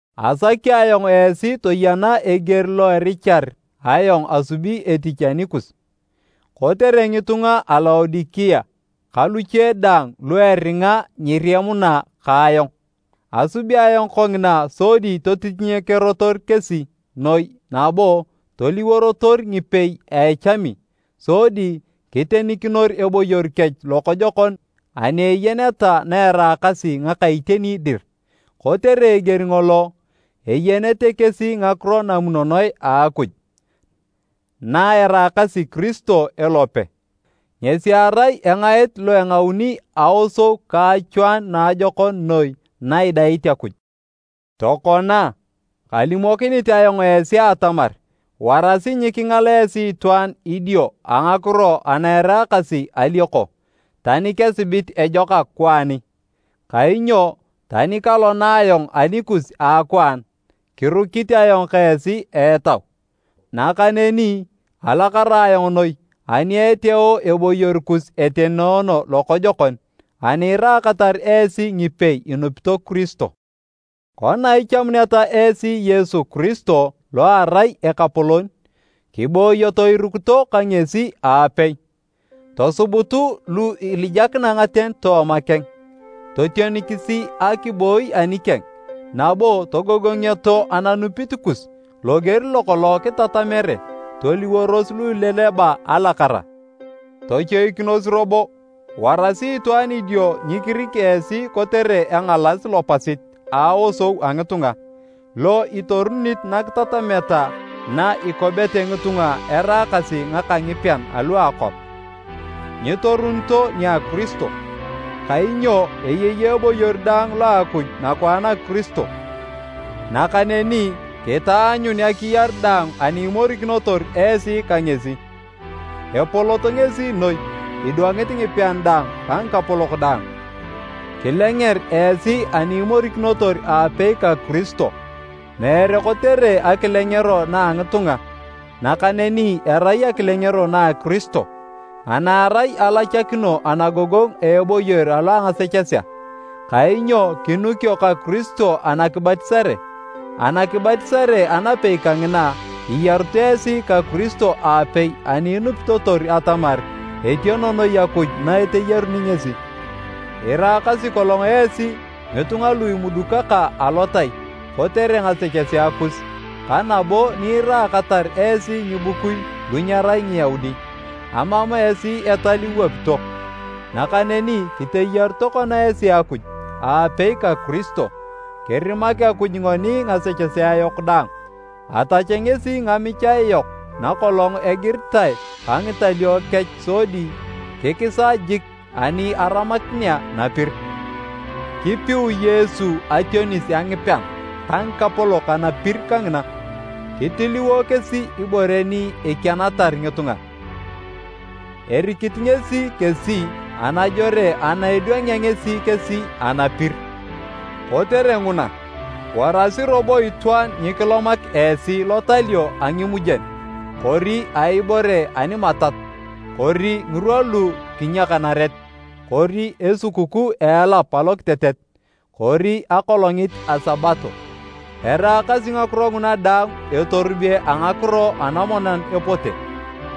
Asaki ayong esi toyena eger lo erichar ayong asubi etich anikus, kotere ngitunga a Laodikea ka luche daang lu eringa nyiriemuna ka ayong. Asubi ayong kongina sodi totitinyekerotor kesi noi nabo toliworotor ngipei a echami sodi kitenikinor eboyor kech lokojokon ani eyeneta na eraakasi ngaka iteni dir. Kotere eger ngolo, eyenete kesi ngakiro namunonoe a Akuj, na eraakasi Kiristo elope. Ngesi erai engaet lo engauni aosou ka achwaanu naajokon noi na idait Akuj. Tokona, kalimokinit ayong esi atamar warasi nyikingal esi itwaan idio a ngakiro ana eraakasi alioko, tani kesibit ejokak kwaani. Kainyo, tani kalona ayong anikus a akwaan, kirukit ayong ka esi a etau. Nakaneni alakara ayong noi ani eteeo eboyor kus etenoono lokojokon ani iraakatar esi ngipei inupito Kiristo. Kona ichamuneta esi Yesu Kiristo lo erai Ekapolon, kiboyoto irukito ka ngesi aapei. Tosubutu lu ilijakina ngaten tooma keng. Totionikisi akiboi anikeng nabo togogongioto ananupit kus loger lokolong kitatamere. Toliworos lu ileleba alakara. Tochoikinos robo warasi itwaan idio nyikirik esi kotere engalas lopasit a aosou a ngitunga, lo itorunit nakitatameta na ikobete ngitunga eraakasi ngaka ngipean alu a akwap, nyitorunito nia Kiristo. Kainyo eyei eboyor daang lo a Akuj nakwaan a Kiristo, nakaneni kitaanyun akiyar daang ani imorikinotor esi ka ngesi. Epolot ngesi noi idwangit ngipean daang ka ngikapolok daang. Kilenger esi ani imorikinotor aapei ka Kiristo. Meere kotere akilengero na a ngitunga, nakaneni erai akilengero na Kiristo, ana erai alachakino anagogongu a eboyor alo a ngasechesea. Kainyo kinukio ka Kiristo anakibatisare, anakibatisare anapei kangina, iyarut esi ka Kiristo aapei ani inupitotor atamar etiono noi Akuj na eteyaruni ngesi. Iraakasi kolong esi ngitunga lu imudukaka alotai kotere ngasechesea kus ka nabo ni iraakatar esi ngibukui lu nyerai Ngiyaudi, amam esi etal iwapito. Nakaneni kiteyaru tokona esi Akuj aapei ka Kiristo. Kirimak Akuj ngoni ngasechesea yok daang, atach ngesi ngamichae yok nakolong egiritae ka ngitalio kech sodi kikisa jik ani aramakinea napir. Kipiu Yesu ationis a ngipean ka ngikapolok anapir kangina, kitiliwo kesi ibore ni ekianatar ngitunga, erikit ngesi kesi anajore ana edwangea ngesi kesi anapir. Kotere nguna, warasi robo itwaan nyikilomak esi lotalio a ngimujen kori a ibore ani matat, kori ngirwa lu kinyakanaret, kori esikukuu a elap alokitetet kori akolongit a Sabato. Eraakasi ngakiro nguna daang etorube a ngakiro anamonan epote,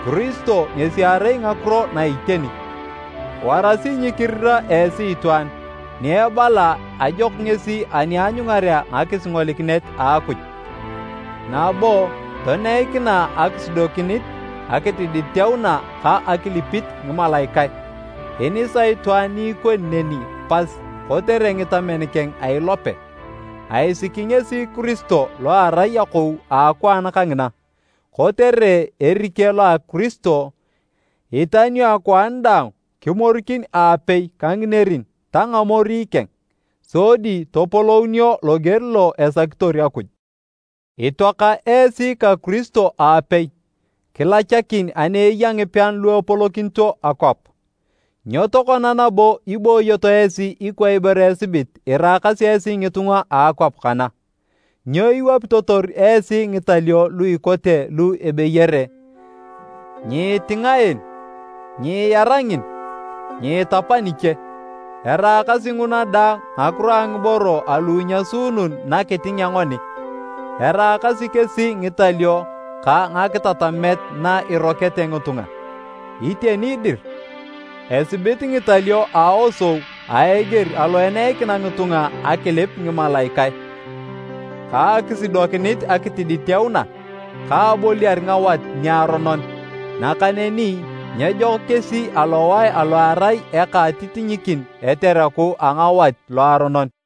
Kiristo ngesi erai ngakiro na iteni. Warasi nyikirira esi itwaan ni ebala ajok ngesi ani aanyungarea ngakisingolikinet a Akuj, nabo toneikina akisudokinit akitiditeuna ka akilipit ngimalaikae. Inisa itwaan ni ikoni neni pas kotere ngitamen keng a ilope. Aisiki ngesi Kiristo lo erai akou a akwaan kangina. Kotere erike lo a Kiristo, itanio akwaan daang kimorikin aapei ka nginerin ta ngamori keng, sodi topolounio loger lo esakitor Akuj. Itoaka esi ka Kiristo aapei kilachakin ani eya ngipean lu epolokinito akwap. Nyo tokona nabo ibooyoto esi ikwa ibore esibit iraakasi esi ngitunga a akwap kana. Nyo iwapitotor esi ngitalio lu ikote lu ebeyere “Nyiitinga en”, “Nyiira ngin”, “Nyiitapa niche”? Eraakasi nguna daang ngakiro a ngiboro alu inyasuunun nakitingea ngoni, eraakasi kesi ngitalio ka ngakitatamet na irokete ngitunga. Iteni dir, esibit ngitalio a aosou a eger alo eneikina ngitunga akilip ngimalaikae, ka akisudokinit akitiditeuna, ka aboliar ngawat niaronon, nakaneni nyejok kesi alowae alo erai eka a atitinyikin etereku a ngawat loaronon.